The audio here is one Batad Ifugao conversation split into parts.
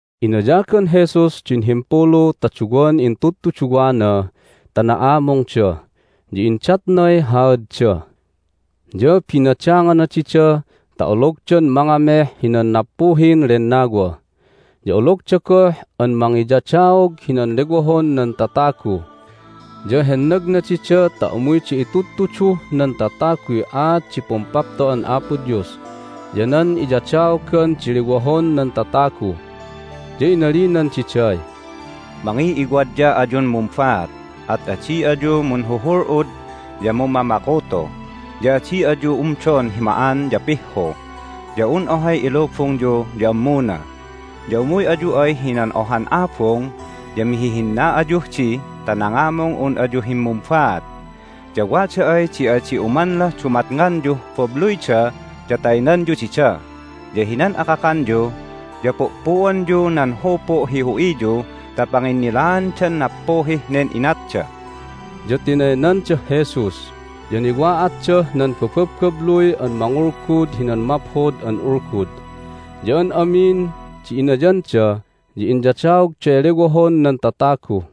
Inayagan Jesus din himpulu ta duwan intudtuduwana ta na'amungda, ya indatnay haadda. Ya binadangana dida ta ologdan mangameh hinan nappuhin lennawa, ya ologda goh an mangiyadaog hinan lewohon nan tatagu. Ya hennagna dida ta umuyda itudtuduh nan tataguy aat di Pumpapto'an Apo Dios, ya nan iyadaogan di lewohon nan tatagu. Ya inalinan diday, "Mangiw'iwadya ayun mumbaat, at adi ayu munhuhul'ud ya mummamakuto, ya adi ayu umdon hi ma'an ya pihhu, ya un ohay ilubungyu ya ammuna. Ya umuy ayu ay hinan ohan abung ya mihihinna ayuh di ta nangamung un ayu himmumbaat. Ya wada ay di adi umanlah dumatnganyuh babluyda ya taynanyu dida. Ya hinan akakanyu ya pu'pu'anyu nan hupu' hi hu'iyu ta panginnilaandan nappuhih nen inatda." Ya tinaynandah Jesus, ya niwa'atdah nan bababbabluy an mangulgud hinan Maphod an Ulgud. Ya an amin di inayanda ya inyadaogday lewohon nan tatagu.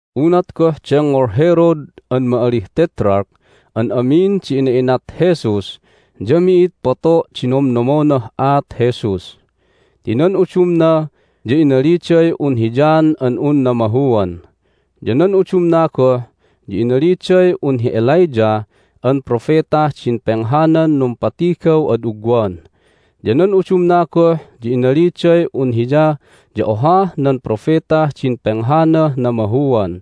Unat goh dengngol Herod an ma'alih Tetrarch an amin di ina'inat Jesus ya mi'id poto' di nomnomonah aat Jesus. Ti nan udumna ya inaliday un hi John an un namahuan, ya nan udumna goh ya inaliday un hi Elijah an propetah din penghanan numpatigaw ad ugwan, ya nan udumna goh ya inaliday un Hiya ya ohah nan propetah din penghanah namahuan.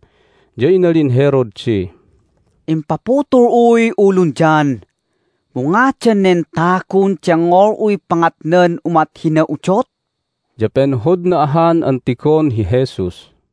Ya inalin Herod di, "Impaputul'uy ulun John, mu ngadan nen tagun dengngol'uy pangatnan umat hina udot?" Ya penhodna ahan an tigon hi Jesus.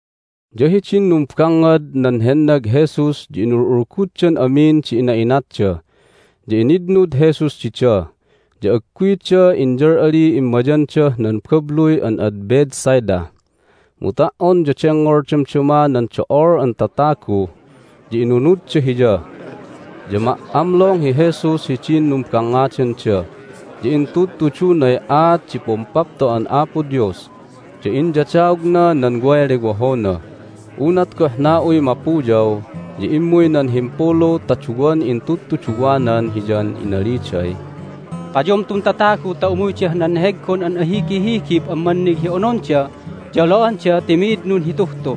Ya hidin numbangngad nan hennag Jesus ya inul'ulguddan amin di ina'inatda. Ya initnud Jesus dida, ya agguyda inyal'aliy immayandah nan babluy an ad Bethsaida. Mu ta"on ya dengngol damdama nan do'ol an tatagu, ya inunudda Hiya. Ya ma"amlong hi Jesus hidin numbangngadanda, ya intudtudunay aat di Pumpapto'an Apo Dios, ya inyadaogna nan way lewohona. Unat goh na'uy mapuyaw ya immuy nan himpulu ta duwan intudtuduwanan Hiyan inaliday, "Payom tun tatagu ta umuydah nan neheggon an ahigihigib an mannig hi ononda ya olo'anda ti mi'id nunhituh tu."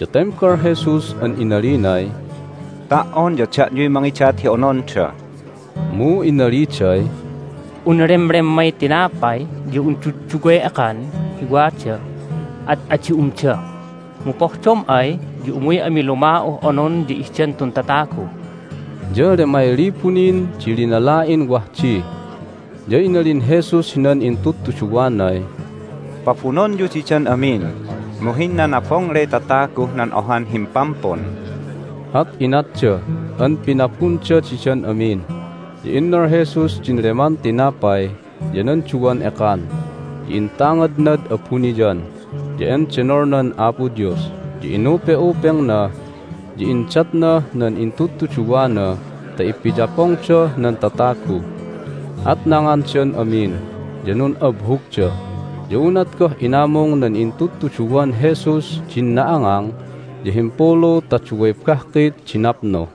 Ya tembal Jesus an inalinay, "Ta"on ya da'yuy mangidat hi ononda." Mu inaliday, "Un lemlemmay tinapay ya un dudduway ekan hi wada, at adi umda! Mu pohdom ay ya umuy ami luma'uh onon ya ihdan tun tatagu." (Ya lemay libu nin di linala'in wah di.) Ya inalin Jesus hinan intudtuduwanay, "Pabunonyu didan amin, mu hinnanabongley tataguh nan ohan himpampun." At inatda an pinabunda didan amin. Ya innal Jesus din leman tinapay ya nan duwan ekan, ya intangadnad abuniyan, ya endenolnan Apo Dios, ya inupe'upengna, ya indatnah nan intudtuduwana ta ipiyapongdah nan tatagu. At nangandan amin, ya nun'abhugda. Ya unat goh inamung nan intudtuduwan Jesus di na'angang ya himpulu ta duway bahkit di napnu.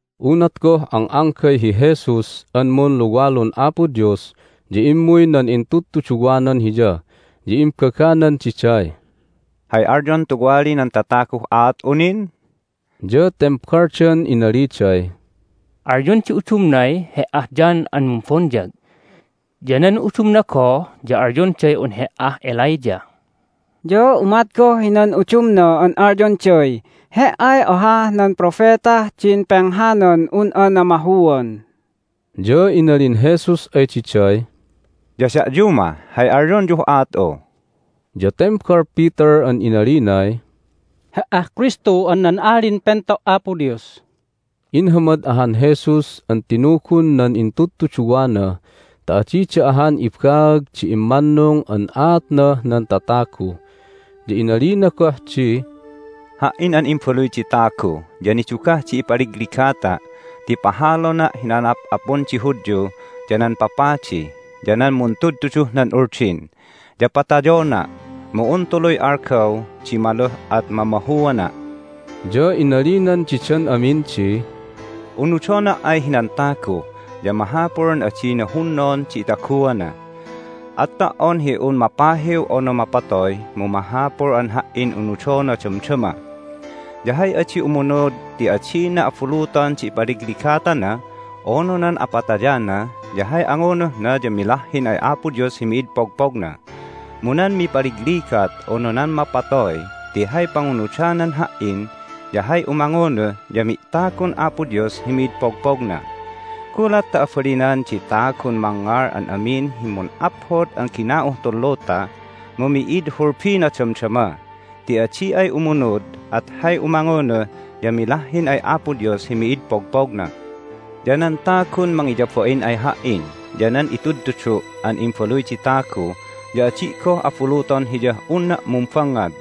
Unat goh ang'anggay hi Jesus an munluwalun Apo Dios ya immuy nan intudtuduwanan Hiya. Ya imbaganan diday, "Hay alyon tuwali nan tataguh aat'u nin?" Ya tembaldan inaliday, "Alyon di udumnay He"ah John an Mumbonyag. Ya nan udumna goh ya alyonday un He"ah Elijah. Ya umat goh hinan udumna an alyonday He"ay ohah nan propetah din penghanan un'a namahuan." Ya inalin Jesus ay diday, "Ya da'yu mah, hay alyonyuh aat'u?" Ya tembal Peter an inalinay, "He"ah Kristu an nan Alin Pento' Apo Dios!" Inhamad ahan Jesus an tinugun nan intudtuduwana ta adida ahan ibaag di immannung an aatnah nan tatagu. Ya inalina goh di, "Ha"in an Imbaluy di Tagu ya nidugah di ipaligligatana' ti pahalona' hinan a'ap'apun di Hudyu, ya nan papadi, ya nan muntudtuduh nan Uldin. Ya patayona', mu un tuluy algaw di maluh at mamahuana'." Ya inalinan didan amin di, "Unudona' ay hinan tagu ya mahapul an adina hunnon di itaguana, at ta"on hi un mapahiw unu mapatoy mu mahapul an Ha"in unudona damdama. Ya hay adi umunud ti adina abuluton di ipaligligatana unu nan apatayana ya hay angunuhna ya milahhin ay Apo Dios hi mid pogpogna. Mu nan mipaligligat unu nan mapatoy ti hay pangunudanan Ha"in ya hay umangunuh ya mi'tagun Apo Dios hi mid pogpogna. Gulat ta abalinan di tagun mangngal an amin hi mun'aphod an gina'uh tun luta, mu mi'id hulbina damdama ti adi ay umunud at hay umangunuh ya milahhin ay Apo Dios hi mid pogpogna. Ya nan tagun mangiyabain ay Ha"in ya nan itudtudu' an Imbaluy di Tagu ya adi' goh abuluton hiyah unna' mumbangngad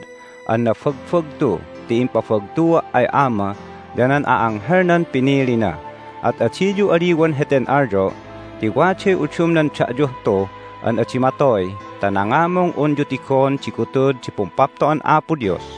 an nabagbagtu ti impabagtua' ay Ama ya nan a'anghelnan pinilina. At adiyu aliwan heten alyo'! Ti waday udumnan da'yuh tu an adi matoy ta nangamung unyu tigon di gutud di Pumpapto'an Apo Dios."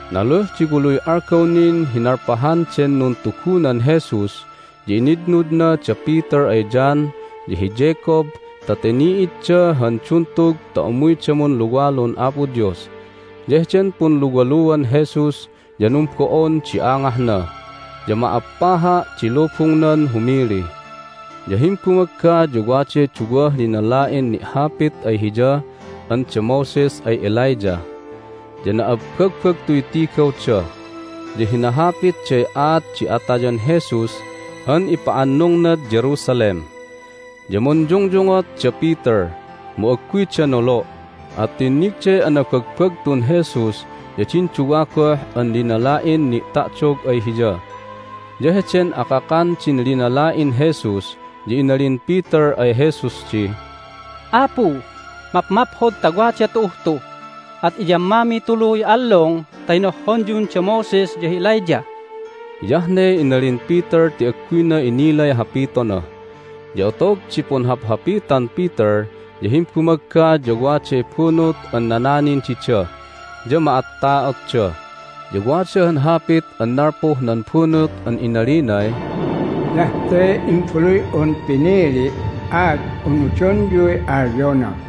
Naluh di waluy algaw nin hi nalpahan den nuntugunan Jesus ya initnudna da Peter ay John, ya hi Jacob ta tini'idda han duntug ta umuyda munluwalun Apo Dios. Ya heden punluwaluan Jesus ya numbo'on di angahna, ya ma'appaha' di lubungnan humili. Ya himbumagga ya waday duwah linala'in ni'hapit ay Hiya an da Moses ay Elijah. Ya na'abbagbagtuy tigawda, ya hinahapitday aat di atayan Jesus an ipa'annungnad Jerusalem. Ya munyungyungot da Peter, mu agguyda nolo', at tinnigday anabagbagtun Jesus ya din duwa goh an linala'in ni'ta'dog ay Hiya. Ya heden akakan din linala'in Jesus ya inalin Peter ay Jesus di, "Apu, mapmaphod ta wada tu'uh tu! At iyammamiy tuluy allung ta hinohhonyun da Moses ya hi Elijah." (Hiyah ne inalin Peter ti agguyna inilay hapitona.) Ya otog di punhaphapitan Peter ya himbumagga ya waday bunut an nananin dida, ya ma'atta'otda. Ya wada han hapit an nalpuh nan bunut an inalinay, "Hiyah te Imbaluy'un pinili', at unudonyuy alyona!"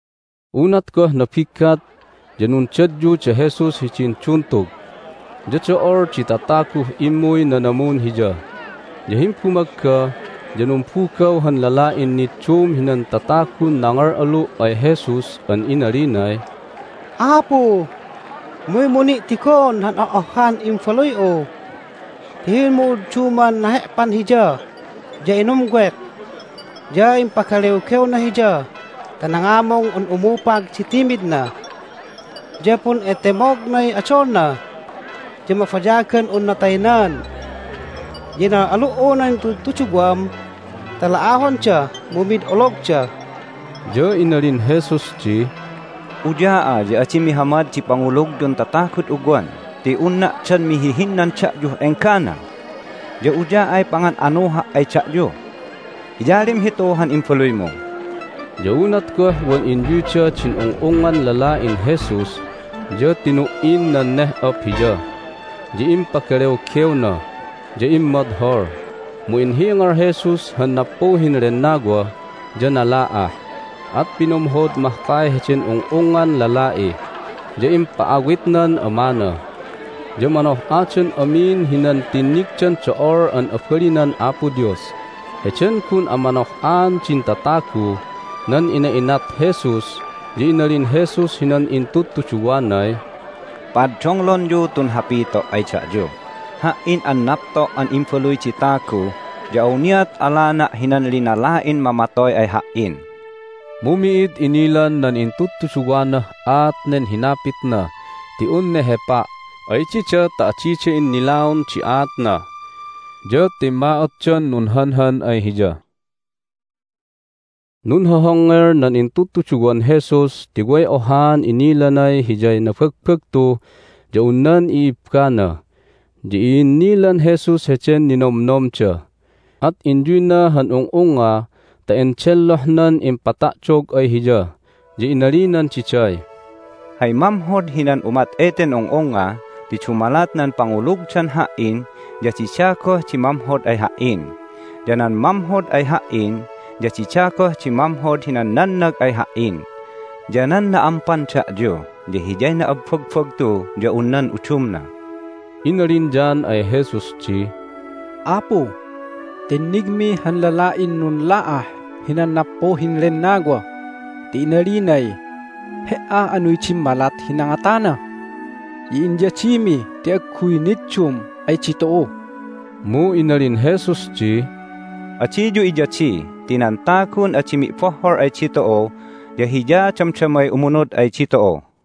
Unat goh nabiggat ya nundadyu da Jesus hidin duntug, ya do'ol di tataguh immuy nanamun Hiya. Ya himbumagga ya numbugaw han lala'in niddum hinan tatagun nangal'alu' ay Jesus an inalinay, "Apu, umuymu ni' tigon han oh'ohhan imbaluy'u! Ti hin'umu'udduman nahe'pan hiya, ya inumwek, ya ipagalewgewna hiya ta nangamung un umupag di timidna. Ya pun'itemognay odolna, ya mabayagan unna taynan. Ya inal'alu"u nan intudtuduwam ta la'ahonda, mu mid ologda!" Ya inalin Jesus di, "Uya'a ya adi mihamad di pangulugyun tatagud ugwan ti unna' dan mihihinnan da'yuh enggana? Ya uya'ay pangan'anuha' ay da'yu? Iyalim hitu han imbaluymu." Ya unat goh wan inyuyda din ung'ungngan lala'in Jesus ya tinu"in nan neh'op hiya, ya impagalewgewna, ya immodhol. Mu inhingal Jesus han nappuhin lennawa, ya nala'ah. At pinumhod mahkay heden ung'ungngan lala'i, ya impa'awitnan amana. Ya manoh'adan amin hinan tinnigdan do'ol an abalinan Apo Dios. Heden gun amanoh'aan din tataguh nan ina'inat Jesus ya inalin Jesus hinan intudtuduwanay, "Pa'addonglonyu tun hapito' ay da'yu: Ha"in an napto' an Imbaluy di Tagu ya awniat alana' hinan linala'in mamatoy ay Ha"in." Mu mi'id inilan nan intudtuduwanah aat nen hinapitna ti un nehepa' ay dida ta adida innilaon aatna. Ya timma'otdan nunhanhan ay Hiya. Nunhohongngel nan intudtuduwan Jesus ti way ohaan inalinay hiyay nabagbagtu ya un nan i'ibbana. Ya i'innilan Jesus heden ninomnomda, at inyuyna han ung'ungnga ta endellohnan impata'dog ay Hiya, ya inalinan diday, "Hay mamhod hinan umat eten ung'ungnga ti dumalat nan pangulugdan Ha"in ya dida goh di mamhod ay Ha"in, ya nan mamhod ay Ha"in ya dida goh di mamhod hinan nannag ay Ha"in. Ya nan na"ampan da'yu ya hiyay na'abbagbagtu ya un nan udumna." Inalin John ay Jesus di, "Apu, tinnigmi han lala'in nunla'ah hinan nappuhin lennawa ti inalinay He"a anuy dimmalat hi nangatana! Ya inyadimi ti agguy niddum ay ditu'u!" Mu inalin Jesus di, "Adiyu iyadi ti nan tagun adi mi'bohhol ay ditu'u ya hiya damdamay umunud ay ditu'u."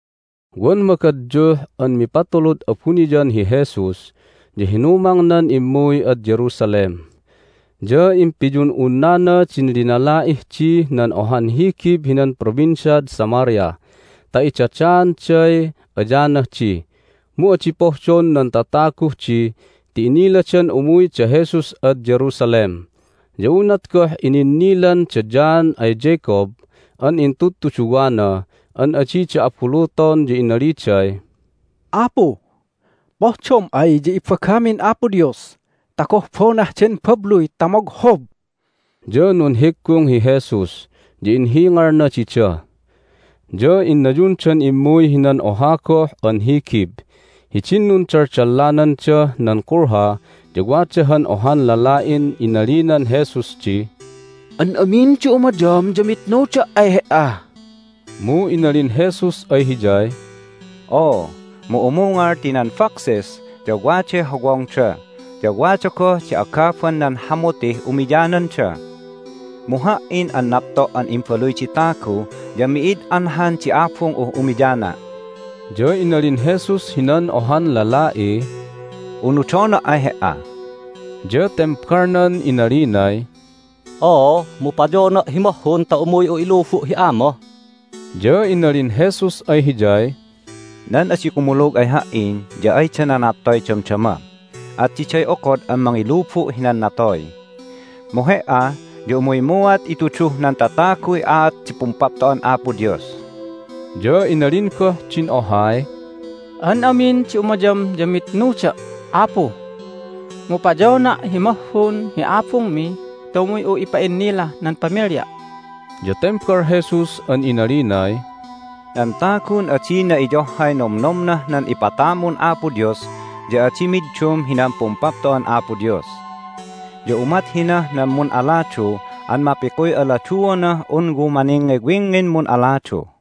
Wan magadyuh an mipatulud abuniyan hi Jesus ya hinumangnan immuy ad Jerusalem. Ya impiyun'unnana din linala'ih dih nan ohan higib hinan Provinciad Samaria ta idadaanday ayanah di. Mu adi pohdon nan tataguh di ti iniladan umuy da Jesus ad Jerusalem. Ya unat goh ininnilan da John ay Jacob an intudtuduwana an adida abuluton ya inaliday, "Apu, pohdom ay ya ibagamin Apo Dios ta gohbonah den babluy ta moghob!" Ya nunhiggung hi Jesus, ya inhingalna dida. Ya innayundan immuy hinan oha goh an higib. Hidin nundaldallanandah nan kulha ya wada han ohan lala'in inalinan Jesus di, "An amin di umayam ya mitnuda' ay He"a." Mu inalin Jesus ay hiyay, "Oo, mu umungal ti nan foxes ya waday hawongda, ya wada goh di agaban nan hamutih umiyananda. Mu Ha"in an napto' an Imbaluy di Tagu ya mi'id anhan di abung'uh umiyana'." Ya inalin Jesus hinan ohan lala'iy, "Unudona' ay he"a." Ya tembalnan inalinay, "Oo, mu payona' hi mahhun ta umuy'u ilubu' hi ama." Ya inalin Jesus ay hiyay, "Nan adi kumulug ay Ha"in ya ayda nanattoy damdama, at diday okod an mangilubu' hinan natoy. Mu he"a ya umuymuat ituduh nan tataguy aat di Pumpapto'an Apo Dios." Ya inalin goh din ohay, "An amin di umayam ya mitnuda', Apu! Mu payona' hi mahhun hi abungmi ta umuy'u ipa'innilah nan pamilya'." Ya tembal Jesus an inalinay, "Nan tagun adinan iyohhay nomnomnah nan ipatamun Apo Dios ya adi middum hinan Pumpapto'an Apo Dios. Ya umat hinah nan mun'aladu an mapikuy aladuonah un wumaningngiwingngin mun'aladu."